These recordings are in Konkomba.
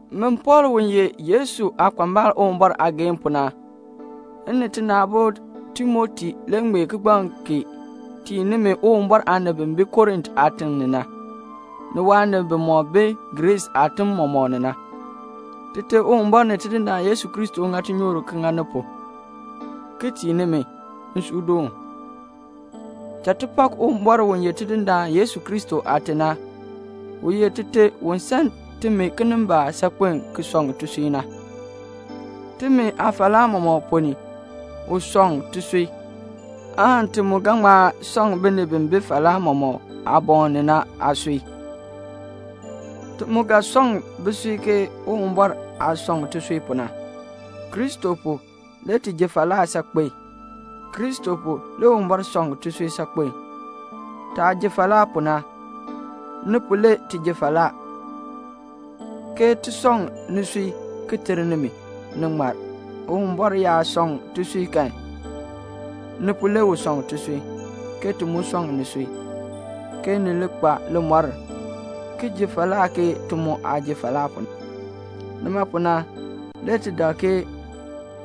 Min Pɔɔl u ye Yesu aakpambal Uwumbɔr aageehn pu na, m ni tina aabo Timoti le ŋmee kigbaŋ kee tii nimi Uwumbɔr aanib bi bi Korint aatiŋ ni na, ni waanib bimɔk bi Griis aatim mɔmɔk ni na. Tite Uwumbɔr ni Tidindaan Yesu Kristo ŋa tinyoor ŋa ni pu, ki tii nimi nsuudoon. Cha ti pak Uwumɔr u ye Tidindaan Yesu Kristo Aate na. U ye Tite u san timi kinimbaak saakpen ki sɔŋ tisui na. Timi aafalaa mɔmɔk ponn ni u sɔŋ tisui, aan ti mu ga ŋma sɔŋ binib bi bi falaa mɔk aaboŋ ni na aasui. Ti mu ga sɔŋ bisui Uwumbɔr aah sɔŋ tisui pu na. Kristo pu, le ti ji falaa saakpen. Kristo pu le Uwumbɔr sɔŋ tisui saakpen. Taah ji falaa pu na, ni pu le ti ji falaa, ke ti sɔŋ nisui ki ter nimi, ni ŋmar. Uwumbɔr yaa sɔŋ tisui kan, ni pu le u sɔŋ tisui, ke ti mu sɔŋ nisui, ke ni li kpa limɔr ki ji falaa ke ti mu aah ji falaa pu na. Nima pu na, le ti dak ke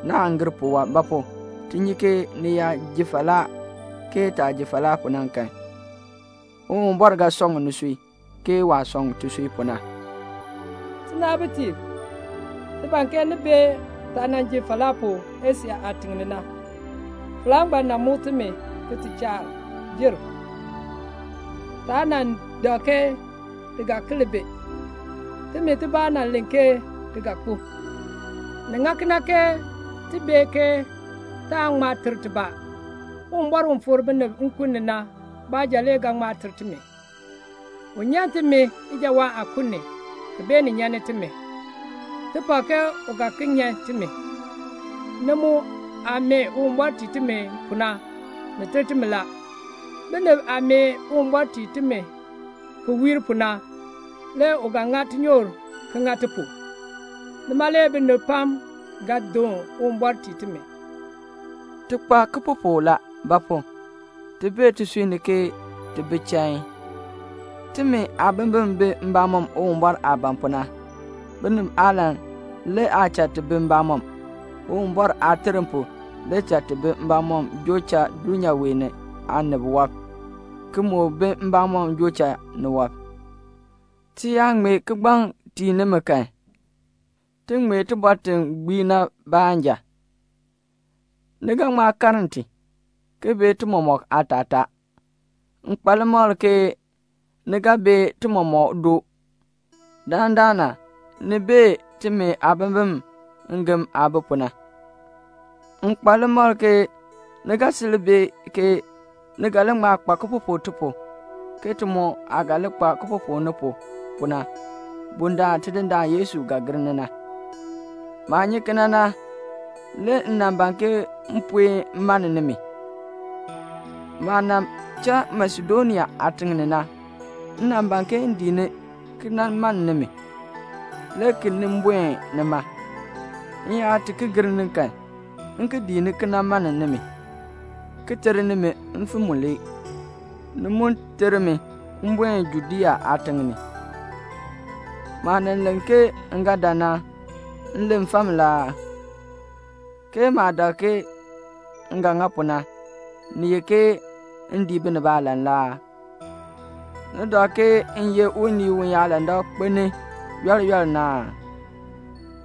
naan gir puwɔb. Ba pu? ti nyi ke ni yaa ji falaa ke taah ji falaa pu na kan, Uwumbɔr ga sɔŋ nisui, ke waah sɔŋ tisui pu na. Tinaabitiib, ti ban ke ni bee taah nan ji falaa pu Asia aatiŋ ni na. Falaa ngbaan nan muk timi ki ti chaa jer. Taa nan dak ke ti ga ki li bi. Timi tibaa nan len ke ti ga kpo. Ni ŋa kena ke ti bee ke taan ŋma ter tibaa. Uwumbɔr u fikr binib nkun ni na baanja le ga ŋma ter timi. U nyan timi ijawaan aakun ni, ki beenin nyani timi. Ti pak ke u ga ki nyan timi. Ni mu aah mee Uwumbɔr tii timi pu na, ni ter timi la. Binib aah mee Uwumbɔr tii timi ki wiir pu na, le u ga ŋa tinyoor ki ŋa ti pu. Nima le binib pam ga doon Uwumbɔr tii timi. Ti kpa kipupuk la; ba pu? ti bee tisui ni ke ti bi chain. Timi aabimbin bi mbamɔm Uwumbɔr aah ban pu na. Binib aalan le aa cha ti bi mbamɔm, Uwumbɔr aaterm pu, le cha ti bi mbamɔm joo cha dulnyaa wee ni aanib wɔb, ki moo bi mbamɔm joo cha niwɔb. Ti yaa ŋmee kigbaŋ tii nimi kan, ti ŋmee tibɔr ti gbii na baanja. Ni ga ŋma karn ti, ki bee ti mɔmɔk aatataa. M kpa limakl ke ni ga bee ti mɔmɔk doo. Dandana ni bee timi aabimbin ngem aah bi pu na. M kpa limakl ke ni ga sil bee ke ni ga li ŋma kpa kipupuk ti pu, ke ti mu aah ga li kpa kipupuk ni pu, pu na, bundaln Tidindaan Yesu ga gir ni na. Maah nyi kena na, le m nan ban ke m puen mann nimi. Maah nan cha Masedonia aatiŋ ni na, m nan ban ke m dii ni ki nan mann nimi, le ki nin buen nima; m yaa ti ki gir ni kan, m ki dii ni ki nan mann nimi, ki ter nimi mfim mulee, ni mu ter mi m buen Judea aatiŋ ni. Maah nan len ke m ga dan na, m len fam la aa? ke maah dak ke m ga ŋa pu na, ni ye ke m dii binib aalan la aa? Ni dak ke m ye unii uyaalandak kpelni yɔl yɔl na aa?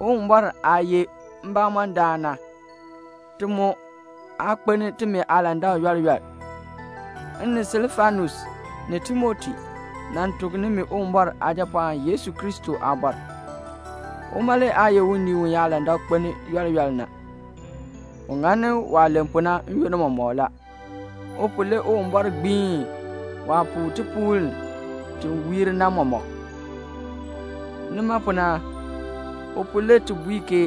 Uwumbɔr aah ye mbamɔndaan na, ti mu aa kpelni timi aalandak yɔl yɔl. M ni Silfanus ni Timoti nan tuk nimi Uwumbɔr Aajapɔɔn Yesu Kristo aabɔr. Uma le aa ye unii uyaalandak kpelni yɔl yɔl na. U ŋani waah len pu na n-yoonn mɔmɔk la. U pu, le Uwumbɔr gbiin waah puu tipuul ti wiir na mɔmɔk. Nima pu na, u pu le ti bui ke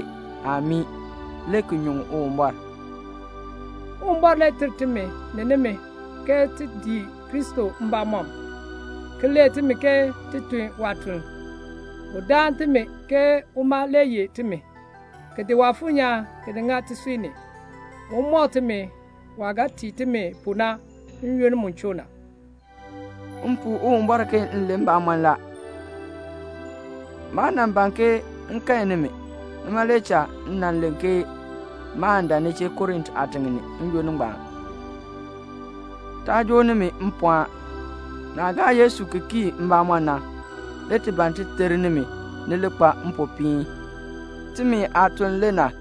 "Amii," le ki nyuŋ Uwumbɔr. Uwumbɔr le ter timi ni nimi ke ti dii Kristo mbamɔm, ki lee timi ke ti tun waatuln. U daan timi ke uma le yeh timi, ki di Waafuur nyaan ki ŋa tisui ni, un mɔk timi waah ga tii timi pu na n-yoonn mu choo na. M puu Uwumbɔr ke m len mbamɔn la; maa nan ban ke m kae nimi, nima le cha m nan len ke maan dan ni chee Korint aatiŋ ni n-yoonn ngbaan. Taa joo nimi mpɔɔn; naah gaa Yesu ki kii mbamɔm na, le ti ban ti ter nimi ni li kpa mpopiin. Timi aatuln le na.